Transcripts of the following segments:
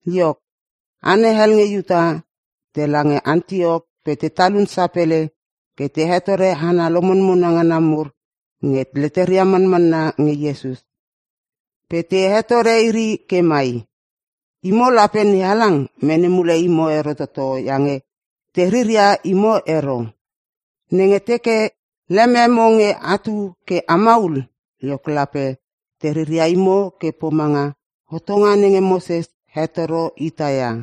Iok, hana hel nge Iuta tela nge Antiok pe te talun sapele ke te hetore hana lomonmona ngana mur nenge leteria manmanna nge Iesus. Pe te hetore iri ke mai, “Imo, lape NeHalang mene mule imo ero toto iange te riria imo ero. Nenge teke lememo nge atu ke a maul, iok lape teriria imo ke pomanga hotonga nenge Moses hetoro ita ia.”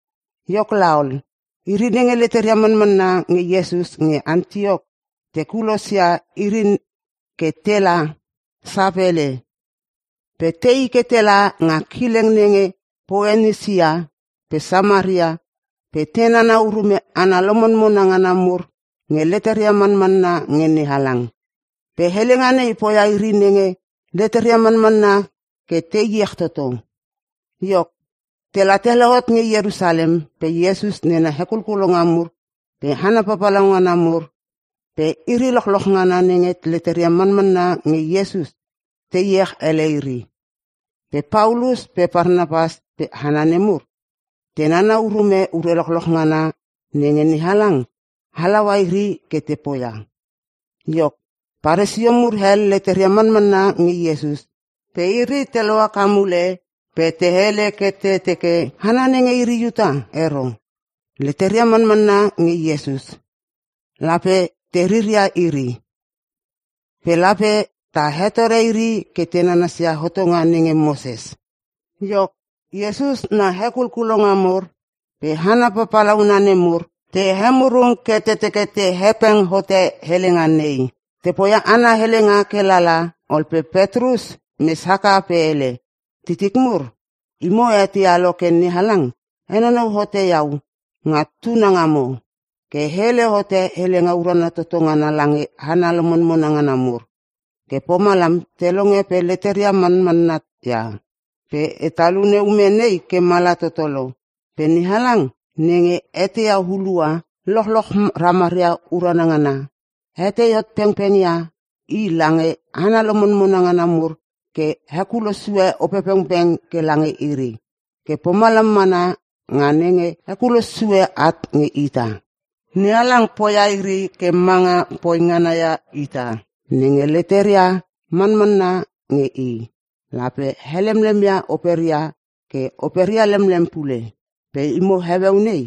Iok laol, iri nenge leteria manmanna nge Iesus nge Antiok te kulosia iri ke tela sapele. Pe tei ke tela nga kileng nenge Poenisia pe Samaria pe te nana urume hana lomonmona ngana mur nge leteria manmanna nge NeHalang. Pe helenga nei poia iri nenge leteria manmanna ke te iech toto. Iok, tela te lohot nge Ierusalem pe Iesus nena hekulkulonga mur pe hana papalauna mur pe iri lochloch ngana nenge leteria manmanna nge Iesus te iech ele iri. Pe Paulus pe Parnapas pe hana nemur te nana urume ure lochloch ngana nenge NeHalang halaua iri ke te poia. Iok, Parisio mur hel leteria manmanna nge Iesus. Pe iri te lohaka mule pe te hele ke te teke, “Hana nenge iri Iuta ero pe leteria manmanna nge Iesus, lape te riria iri. Pe lape ta hetore iri ke te nanasia hotonga nenge Moses.” Iok, Iesus na hekulkulonga mur pe hana papalauna nemur te emurung ke te teke te hepeng hote helenga nei. Te poia ana helenga ke lala ol pe Petrus mes haka pe hele, “Titik mur, imo a eteia lo ke NeHalang henonou hote iau nga tuna ngamo, ke e hele hote helenga urana toto ngana lange hana lomonmona ngana mur. Ke pomalam te longe pe leteria manmanna ia. Pe e talune ume nei ke mala toto lo. Pe NeHalang nenge eteia hulua lochloch ramaria ume ngana, hetei hot pengpeng ia i lange hana lomonmona ngana mur ke hekulo sue Opepengpeng ke lange iri, ke pomalam mana nga nenge hekulo sue at nge ita. NeHalang poia iri ke manga poingana ia ita. Nenge leteria manmanna nge i, lape helemlem ia operia ke operia lemlem pule. Pe imo heueu nei,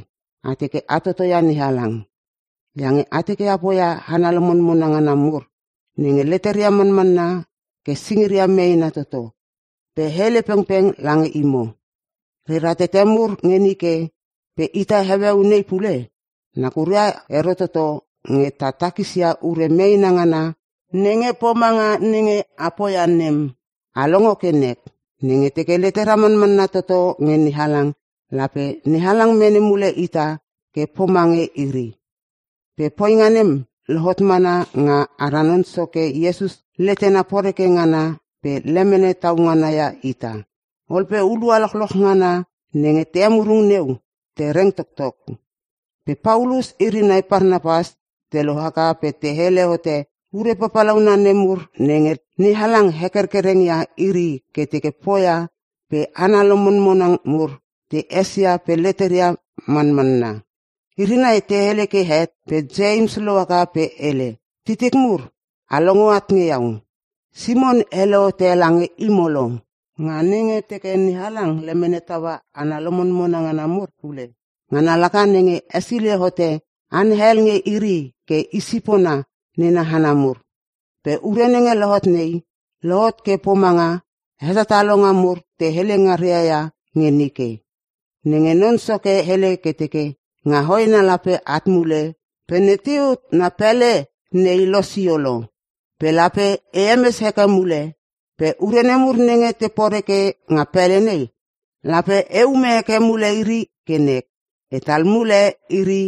a teke a totoia NeHalang. Iange a teke a poia hana lomonmona ngana mur nenge leteria manmanna ke singiria meena toto. Pe e hele pengpeng lange imo, rera tete mur nge nike pe ita heueu nei pule, nakura ero toto nge ta takisia ure meena ngana nenge pomanga nenge a poia nem. A longo ke nek, nenge teke letera manmanna toto nge NeHalang lape NeHalang mene mule ita ke pomange iri. Pe poinga nem lohot mana nga ara Non Soke Iesus letena poreke ngana pe lemene tau ngana ia ita.” Ol pe hulua lochloch ngana nenge te emurung neu te reng toktok. Pe Paulus iri nai Parnapas te lohaka pe te hele hote ure papalauna nemur nenge NeHalang hekerkereng ia iri ke te poia pe hana lomonmona mur te esia pe leteria manmanna. Iri nai te hele ke het pe Ieims lohaka pe hele, “Titik mur, a longo at nge iau! Simon hele hote lange imo lo, nga nenge teke NeHalang lemene taua hana lomonmona ngana mur pule. Ngana laka nenge hesilei hote hana hel nge iri ke i sipona nena hana mur. Pe ure nenge lohot nei, lohot ke pomanga hetatalonga mur te hele ngaria ia nge nike. Nenge Non Soke hele ke teke, “‘Nga hoena lape eat mule pe Teuit na pele nei losio lo. Pe lape e hemes heke mule. Pe ure nemur nenge te poreke nga pele nei, lape eume heke mule iri ke nek pe etal mule iri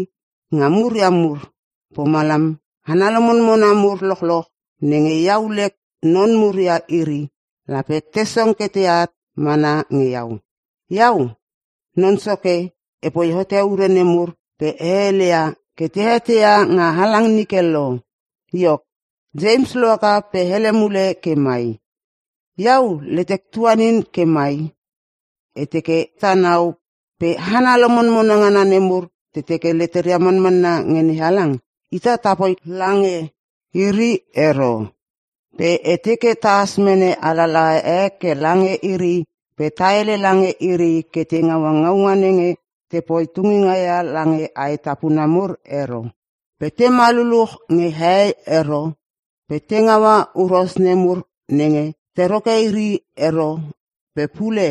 nga muria mur. Pomalam, hana lomonmona mur lochloch nenge iau lek non mur ia iri, lape te song ke teat mana nge iau. Iau, Non Soke, epoi hote ure nemur pe e hele ia ke te eteia nga halang nike lo.’” Iok, Ieims lohaka pe hele mule ke mai, “Iau letek tuanin ke mai! E teke tanau pe hana lomonmona ngana nemur te teke leteria manmanna nge NeHalang, ita tapoi lange iri ero. Pe e teke tahas mene alalaha e ke lange iri pe ta hele lange iri ke te ngaua ngaunga nenge tepoi tunginga ia lange aetapuna mur ero. Pe tema luluch nge hehei ero pe te ngaua huros nemur nenge te roke iri ero pe pule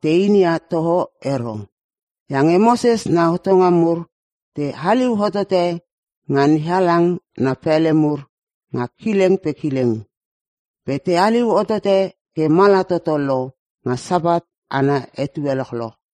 te inia toho ero. Iange Moses na hotonga mur te haliu hotote nga NeHalang na pele mur nga kileng pe kileng. Pe te haliu hotote ke mala toto lo nga Sapat ana etue lochloch.”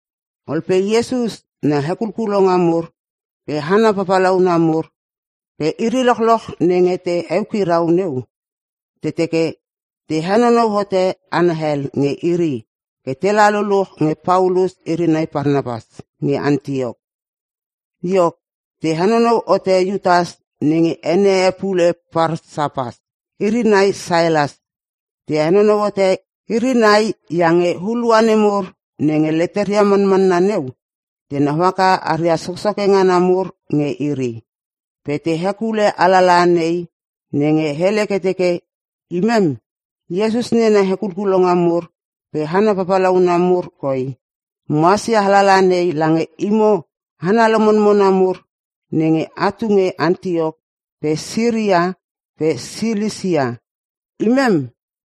Ol pe Iesus na hekulkulonga mur pe hana papalauna mur pe iri lochloch nenge te eukirau neu, te teke te henonou hote hana hel nge iri ke tela luluch nge Paulus iri nai Parnapas nge Antiok. Iok, te henonou hote Iutas (nenge ene e pule Parsapas) iri nai Sailas. Te henonou hote iri nai iange hulua nemur nenge leteria manmanna neu, tenau haka aria soksoke ngana mur nge iri. Pe te hekule alalaha nei nenge hele ke teke; “Imem, Iesus nena hekulkulonga mur pe hana papalauna mur koi, mohas ia alalaha nei lange imo hana lomonmona mur nenge a tu nge Antiok pe Siria pe Silisia. Imem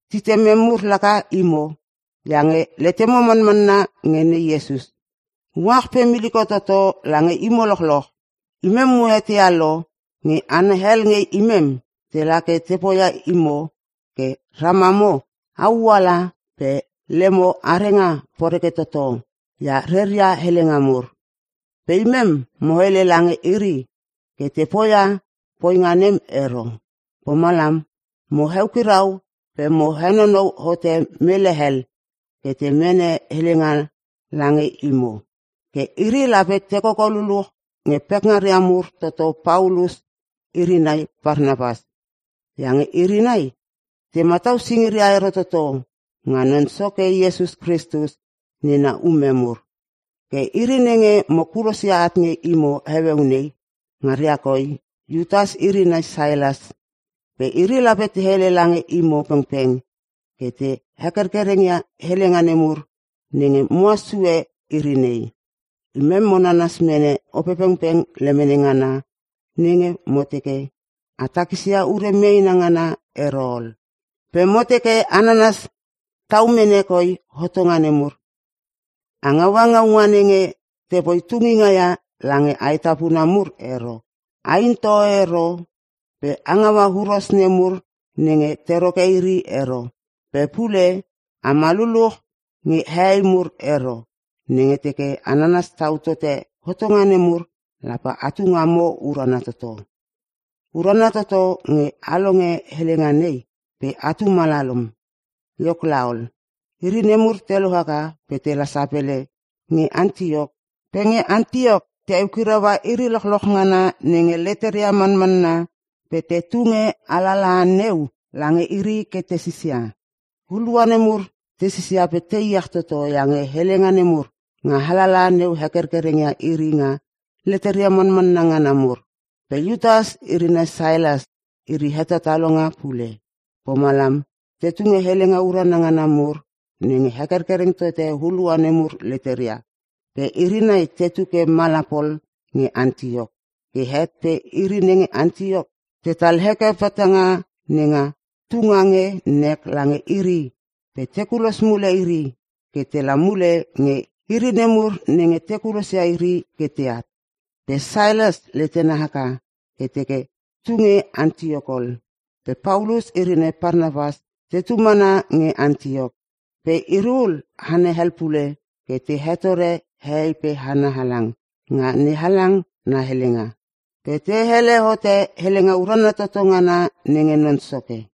titimem mur laka imo iange letemo manmanna nge Ne Iesus. Uach pe miliko toto lange imo lochloch. Imem mo eteia lo nge hana hel nge imem tela ke te poia imo ke ramamo au ala pe lemo arenga poreke toto ia reria helenga mur. Pe imem mo hele lange iri ke te poia poinga nem ero. Pomalam mo eukirau pe mo henonou hote mele hel ke te mene helenga lange imo. Ke iri lape te koko luluch nge pekngara mur toto Paulus iri nai Parnapas. Iange iri nai te matau singiria ero toto nga Non Soke Iesus Kristus nena ume mur. Ke iri nenge mo kulosia at nge imo heueu nei, ngaria koi Iutas iri nai Sailas. Pe iri lape te hele lange imo pengpeng ke te hekerkereng ia helenga nemur nenge mohas sue iri nei. Imem mo nanas mene Opepengpeng lemene ngana nenge mo teke a takisia ure meena ngana ero ol. Pe mo teke a nanas tau mene koi hotonga nemur; A ngaua ngaunga nenge tepoi tunginga ia lange aetapuna mur ero. A in toho ero pe a ngaua huros nemur nenge te roke iri ero. Pe pule, ama luluch nge hehei mur ero. Nenge teke a nanas tau tote hotonga nemur lape atu ngamo urana toto. Urana toto nge a olonge helenga nei pe atu malalom.” Iok laol, iri nemur te lohaka pe tela sapele nge Antiok. Pe nge Antiok te eukiraua iri lochloch ngana nenge leteria manmanna pe te tunge alalaha neu lange iri ke tesisia. Hulua nemur te sisia pe te iech toto iange helenga nemur nga alalaha neu hekerkereng ia iri nga leteria manmanna ngana mur. Pe Iutas iri nai Sailas, iri hetatalonga pule. Pomalam te tunge helenga urana ngana mur nenge hekerkereng tote hulua nemur leteria. Pe iri nai tetu ke mala pol nge Antiok. Ke het pe iri nenge Antiok tetal heke petanga nenga tunga nge nek lange iri pe te kulos mule iri ke tela mule nge iri nemur nenge te kulosia iri ke teat.[ Pe Sailas letena haka ke teke tunge Antiok ol.] Pe Paulus iri nai Parnapas tetu mana nge Antiok, pe iri ul hana hel pule ke te hetore hehei pe hana halang nga NeHalang na helenga, pe te hele hote helenga urana toto ngana nenge Non Soke.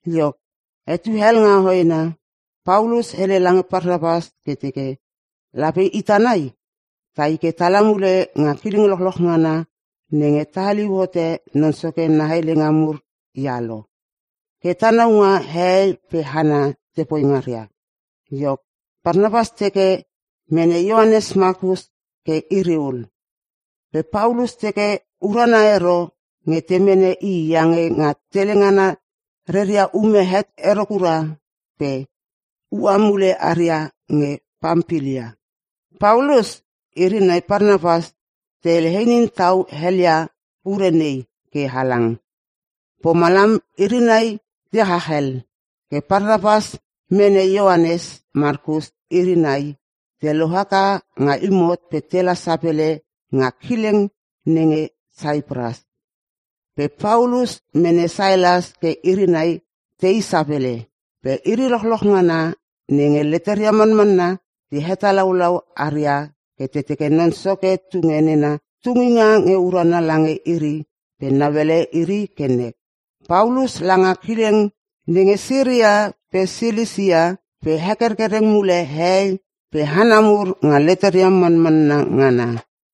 Iok, etue hel nga hoena, Paulus hele lange Parnapas ke teke, “Lape ita nai tai ke tala mule nga kileng lochloch ngana nenge ta haliu hote Non Soke na helenga mur ia lo, ke tanau nga hehei pe hana tepoi ngaria.” Iok, Parnapas teke mene Ioanes Makus ke iri ul. Pe Paulus teke urana ero nge te mene i iange nga tele ngana reria ume het ero kura pe ua mule aria nge Pampilia. Paulus iri nai Parnapas te hele inin tau helia ure nei ke halang. Pomalam iri nai te chach hel. Ke Parnapas mene Ioanes Makus ke iri nai te lohaka nga imot pe tela sapele nga kileng nenge Saipras. Pe Paulus mene Sailas ke iri nai tei sapele. Pe iri lochloch ngana nenge leteria manmanna te hetalaulau aria ke te teke Non Soke tunge nena tunginga nge urana lange iri pe nauele iri ke nek. Paulus langa kileng nenge Siria pe Silisia pe hekerkereng mule hehei pe hana mur nga leteria manmanna ngana.